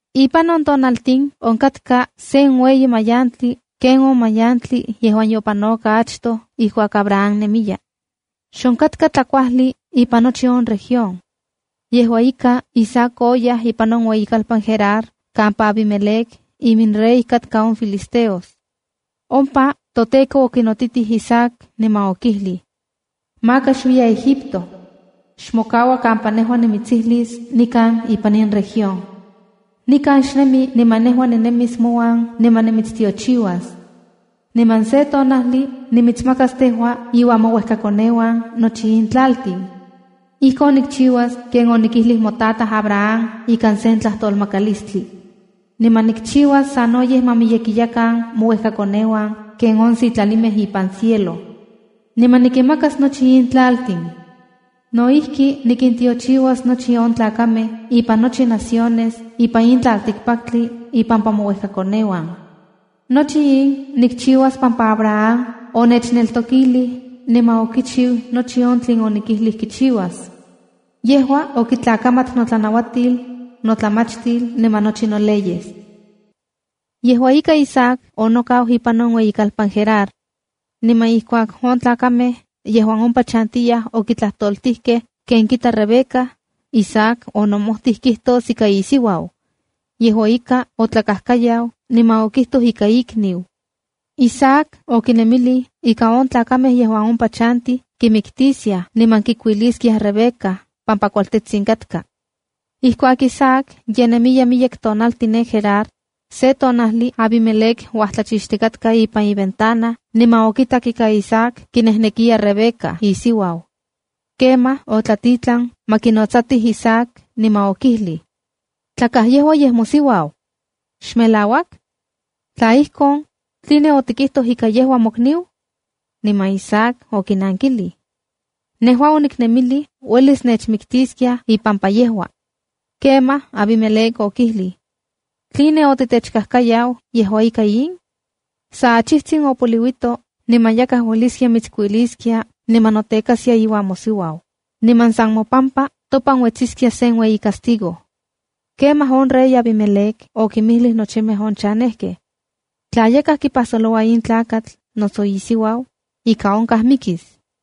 Ipan on tiempo onkatka sen ueyi mayantli ken on mayantli yejuan yopanoka achtoj ijkuak Abraham nemiya. Xonkatka tlakuajli ipan nochi on región. Yejua ika, Isaac oyaj ipan on ueyikalpan Gerar kampa Abimelec iminrey katka on filisteos. Ompa toTEKO okinotitij Isaac niman okijlij: “Maka xuiya Egipto. Xmokaua kampa nejua nimitsijlis nikan ipan in región. Nikan xnemi niman nejua ninemis mouan niman nimitstiochiuas. Niman se tonajli nimitsmakas tejua iuan mouejkakoneuan nochi in tlaltin. Ijkon nikchiuas ken onikijlij motataj Abraham ikan sen tlajtolmakalistli. Niman nikchiuas sanoyej ma miyekiyakan mouejkakoneuan ken on sitlalimej ipan cielo. Niman nikinmakas nochi in tlaltin. No ijki, nikintiochiuas nochi on tlakamej ipan nochi naciones ipan in tlaltikpaktli ipampa mouejkakoneuan. Nochi in nikchiuas pampa Abraham onechneltokilij niman okichiu nochi on tlen onikijlij kichiuas. Yejua okitlakamat notlanauatil, notlamachtil niman nochi noleyes.” Yejua ika, Isaac onokau ipan on ueyikalpan Gerar. Niman ijkuak on tlakamej yejuan ompa chantiyaj okitlajtoltijkej ken kita Rebeca, Isaac onomojtij kijtos ika isiuau. Yejua ika, otlakajkayau niman okijtoj ika ikniu. Isaac okinemilij ika on tlakamej yejuan ompa chantij kimiktiskiaj niman kikuiliskiaj Rebeca pampa kualtetsin katka. Ijkuak Isaac ye nemiya miyek tonaltin ne Gerar, se tonajli Abimelec uajtlachixtikatka ipan iventana niman okitak ika Isaac kinejnekiya Rebeca isiuau. Kemaj otlatitlan ma kinotsatij Isaac niman okijlij: —Tlakaj yejua yej mosiuau. ¿Xmelauak? Tla ijkon, ¿tline otikijtoj ika yejua mokniu? Niman Isaac okinankilij: —Nejua oniknemilij uelis nechmiktiskiaj ipampa yejua. Kemaj Abimelec okijlij: —¿Tline otitechkajkayau yejua ika in? Sa achijtsin opoliuito niman yakaj ueliskia mitskuiliskia niman notekaskia iuan mosiuau, niman san mopampa topan uetsiskia sen ueyi castigo. Kemaj on rey Abimelec okinmijlij nochimej on chanejkej: —Tla yakaj kipajsoloua in tlakatl noso isiuau, ika onkaj mikis.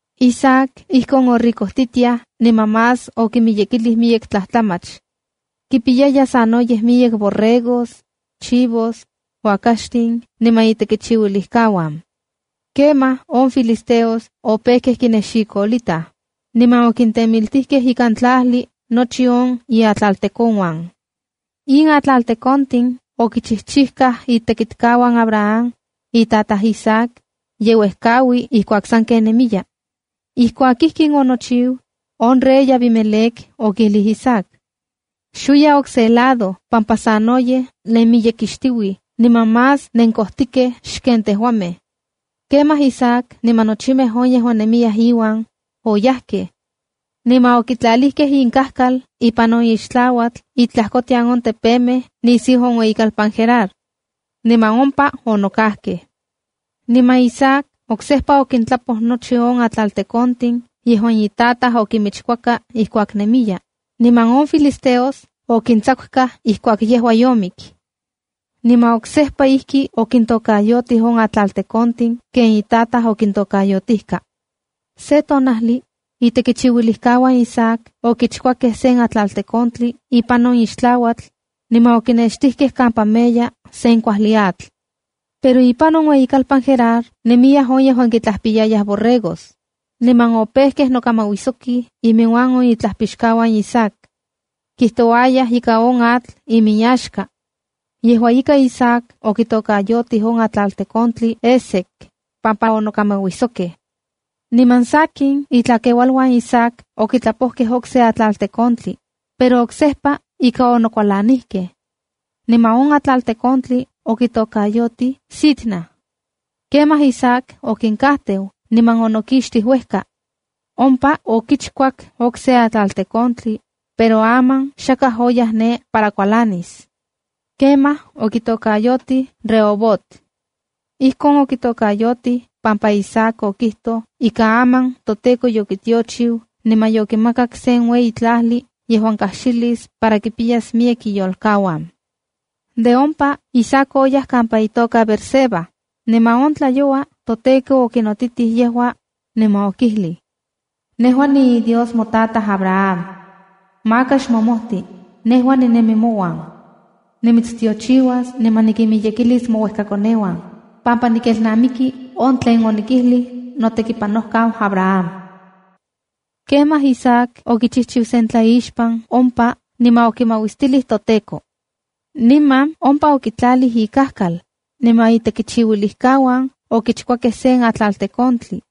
Isaac ijkon oricojtitiaj niman más okimiyekilij miyek tlajtlamach. Kipiyaya sanoyej miyek borregos, chivos, uakaxtin niman itekichiuilijkauan. Kemaj on filisteos opejkej kinexikolitaj, niman okintemiltijkej ikan tlajli nochi on iatlaltekonuan. In atlaltekontin okichijchijkaj itekichiuilijkauan Abraham, itataj Isaac, ye uejkaui ijkuak sanken nemiya. Ijkuak ijkin onochiu, on rey Abimelec okijlij Isaac: —Xuiya okse lado pampa sanoyej nenmiyekixtiuij niman más nenkojtikej xken tejuamej. Kemaj Isaac niman nochimej on yejuan nemiyaj iuan, oyajkej. Niman okintlalikej inkajkal ipan on ixtlauatl itlajkotian on tepemej nisiu on ueyikalpan Gerar. Niman ompa onokajkej. Niman Isaac oksejpa okintlapoj nochi on atlaltekontin yejuan itataj okinmichkuaka ijkuak nemiya, niman on filisteos okintsakukaj ijkuak yejua yomik. Niman oksejpa ijki okintokayotij on atlaltekontin ken itataj okintokayotijka. Se tonajli, itekichiuilijkauan Isaac okichkuakej sen atlaltekontli ipan on ixtlauatl, niman okinextijkej kampa meya sen kuajli atl. Pero ipan on ueyikalpan Gerar, nemiyaj on yejuan kintlajpiyayaj borregos. Niman opejkej nokamauijsokij inmiuan on itlajpixkauan Isaac. Kijtouayaj ika on atl iminyaxka. Yejua ika, Isaac okitokayotij on atlaltekontli Eseca pampa onokamauijsokej. Niman sakin, itlakeualuan Isaac okitlapojkej okse atlaltekontli, pero oksejpa ika onokualanijkej. Niman on atlaltekontli okitokayotij “Sitna”b. Kemaj Isaac okinkajteu niman onokixtij uejka. Ompa okichkuak okse atlaltekontli, pero aman xakaj oyaj ne para kualanis. Kemaj okitokayotij “Rehobot”c. Ijkon okitokayotij pampa Isaac okijtoj ika aman toTEKO yokitiochiu niman yokimakak sen ueyi tlajli yejuan kajxilis para kipiyas miyek iyolkauan. De ompa Isaac oyaj kampa itoka Beerseba, niman on tlayoua toTEKO okinotitij yejua, niman okijlij: “Nejua niiDios motataj Abraham. Maka xmomojti, nejua ninemi mouan. Nimitstiochiuas niman nikinmiyekilis mouejkakoneuan, pampa nikelnamiki on tlen onikijlij notekipanojkau Abraham.” Kemaj Isaac okichijchiu sen tlaixpan ompa niman okimauistilij toTEKO. Niman ompa okitlalij ikajkal, niman itekichiuilijkauan okichkuakej sen atlaltekontli.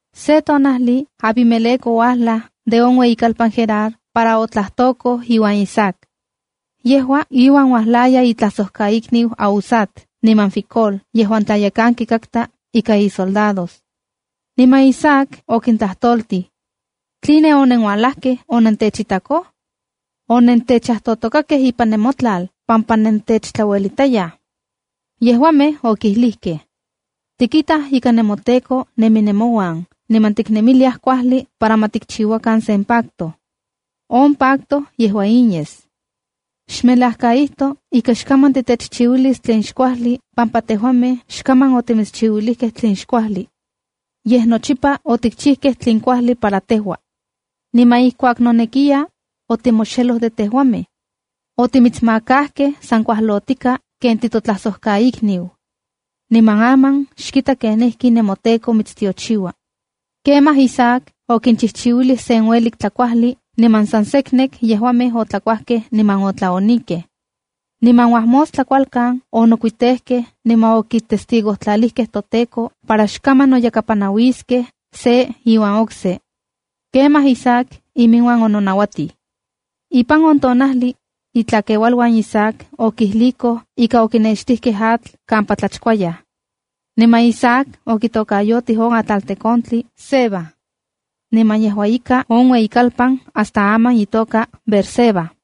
Se tonajli Abimelec ouajlaj de on ueyikalpan Gerar para otlajtokoj iuan Isaac. Yejua iuan uajlaya itlajsojkaikniu Ahuzat niman Ficol yejuan tlayekanki katka ika isoldados. Niman Isaac okintlajtoltij: —¿Tline onenualajkej onentechitakoj? Onentechajtotokakej ipan nemotlal pampa nentechtlauelitayaj. Yejuamej okilijkej: —Tikitaj ika nemoTEKO nemi nemouan, niman tiknemiliaj kuajli para ma tikchiuakan sen pacto. On pacto yejua in yes: Xmelajkaitoj ika xkaman titechchiuilis itlaj xkuajli pampa tejuamej xkaman otimitschiuilijkej itlaj xkuajli. Yej nochipa otimitschiuilijkej on tlen kuajli para tejua. Niman ijkuak nonekiya, otimoxelo de tejuamej. Otimitsmakajkej san kualotika ken titotlajsojkaikniu. Niman aman xkita kenijki nemoTEKO mitstiochiua. Kemaj Isaac okinchijchiuilij sen uelik tlakuajli, niman san seknek yejuamej otlakuajkej niman otlaonikej. Niman uajmostla kualkan, onokuitejkej niman okitestigojtlalijkej toTEKO para xkaman noyakapanauiskej se iuan okse. Kemaj Isaac iminuan ononauatij. Ipan on tonajli, itlakeualuan Isaac okijlijkoj ika okinextijkej atl kampa tlachkuayaj. Niman Isaac okitokayotij on atlaltekontli Sebad. Niman yejua ika on ueyikalpan hasta aman itoka Beersebae.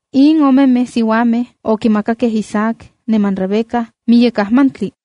In omemej siuamej okimakakej Isaac niman Rebeca miyek ajmantli.